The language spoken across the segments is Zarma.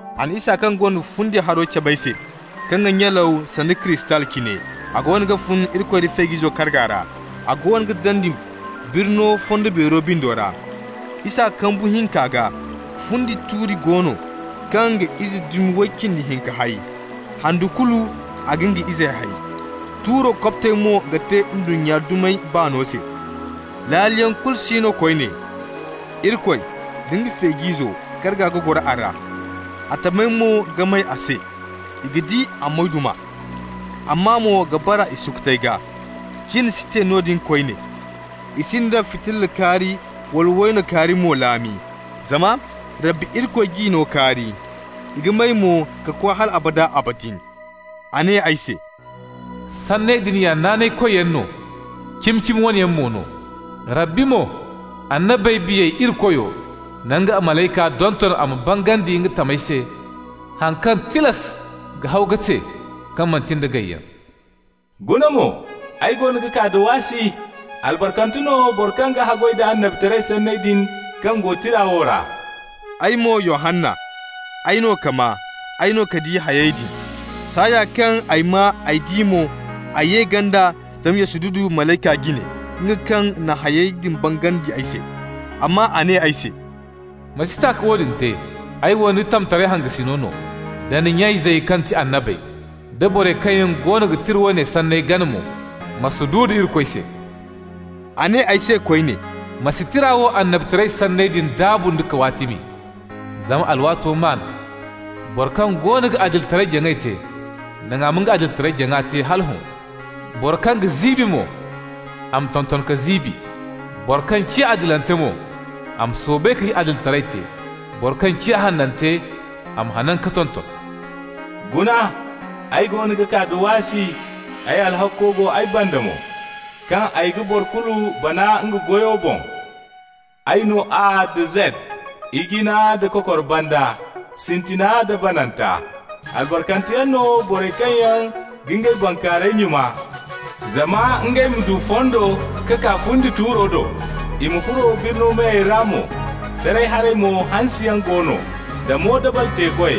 A na isa kaŋ gonda fundi haro cabe ay se kaŋ ga nyalaw sanda kristal cine. A goono ga fun Irikoy da Feej'izo karga ra. A goono ga dandi birno fondo beero bindo ra. Isa kambu hinka gaa, fundi tuuri go no kaŋ ga ize dumi way cindi hinka hay. Handu kulu a ga nga izey hay. Tuuro kobtey mo ga te ndunnya dumey baano se. Laaliyaŋ kulu si no koyne. Irikoy nda Feej'izo karga ga goro a ra, a tamey mo ga may a se. I ga di a moyduma, a maa mo ga bara i sukutey gaa. Cin si te noodin koyne, i sinda fitilla kaari wala wayno kaari mo laami, zama Rabbi Irikoy g'i no kaari. I ga may mo ka koy hal abada abadin. A ne ay se: «Sanney din ya naanaykoyyaŋ no, cimi-cimi wane yaŋ mo no. Rabbi mo, annabey biyey Irikoyo na nga malayka donton a ma bangandi nga tamey se haŋ kaŋ tilas ga haw ka te, kaŋ manti nda gayyaŋ. Guna mo, ay goono ga kaa da waasi! Albarkante no boro kaŋ ga haggoy da annabitaray sanney din kaŋ go tira wo ra.» Ay mo, Yohanna, ay no ka maa, ay no ka di hayey din. Saaya kaŋ ay maa, ay di mo, ay ye ganda zama ya sududu malayka jine, nga kaŋ na hayey din bangandi ay se. Amma a ne ay se: «Ma si ta ka woodin te! Ay wo ni tamtaray hangasin no, da ni nya-izey kaŋ ti annabey, da borey kaŋ yaŋ goono ga tira woone sanney gana mo. Ma sududu Irikoy se!» A ne ay se koyne: «Ma si tira wo annabitaray sanney din daabu nda kawaatimi, zama alwaato maan. Boro kaŋ goono ga adilitaray-jaŋay te, naŋ a ma nga adilitaray-jaŋa te hala hõ. Boro kaŋ ga ziibi mo, a ma tonton ka ziibi. Boro kaŋ ciya adilante mo, a ma soobay ka adilitaray te. Boro kaŋ ciya hanante, a ma hanan ka tonton. Guna, ay goono ga kaa da waasi. Ay alhakko go ay banda mo, kaŋ ay ga boro kulu bana nga goyo boŋ. Ay no A nda Zed, Ijina da Kokor Banda, Sintina nda Bananta. Albarkanteyaŋ no borey kaŋ yaŋ ga ngey bankaarayey nyuna, zama ngey ma du fondo ka kaa fundi tuuro do, i ma furo birni meyey ra mo. Taray haray mo hansiyaŋ go no, da moodabal-teekoy,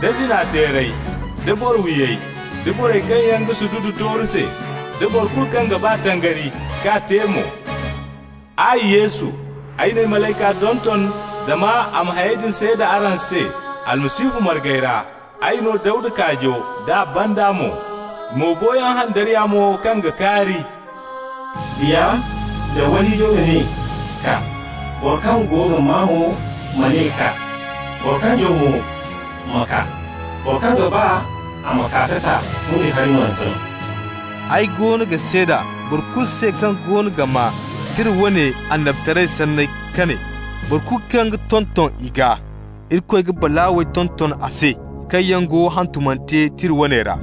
da zina-teerey, da boro-wiyey, da borey kaŋ yaŋ ga sududu tooru se, da boro kulu kaŋ ga ba tangari, k'a te mo. Ay Yesu, ay n'ay malayka donton zama a ma hayey din seeda araŋ se Almasihu margey ra. Ay no Dawda kaajo d'a banda mo, mo boyaŋ handariya mo kaŋ ga kaari.» Biya nda wayhiijo ga ne: «Kaa!» Boro kaŋ go ga maa mo ma ne: «Kaa!» Boro kaŋ jaw mo ma kaa. Boro kaŋ ga ba, a ma kaa ka ta fundi hari, nooyante no. Ay goono ga seeda boro kulu se kaŋ goono ga maa tira woone annabitaray sanney ka ne: boro kulu kaŋ ga tonton i gaa, Irikoy ga balaawey tonton a se kaŋ yaŋ go hantumante tira woone ra.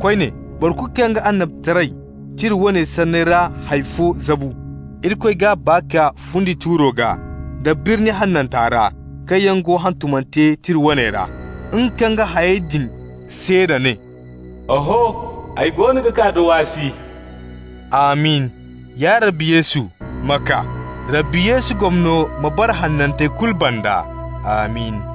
Koyne, boro kulu kaŋ ga annabitaray tira woone sanney ra hay fo zabu, Irikoy g'a baa kaa fundi tuuro gaa, da birni hananta ra, kaŋ yaŋ go hantumante tira woone ra. Nga kaŋ ga hayey din seeda ne: «Oho, ay goono ga kaa da waasi!» Amin! Ya Rabbi Yesu, ma kaa! Rabbi Yesu gomno ma bara hanantey kulu banda. Amin!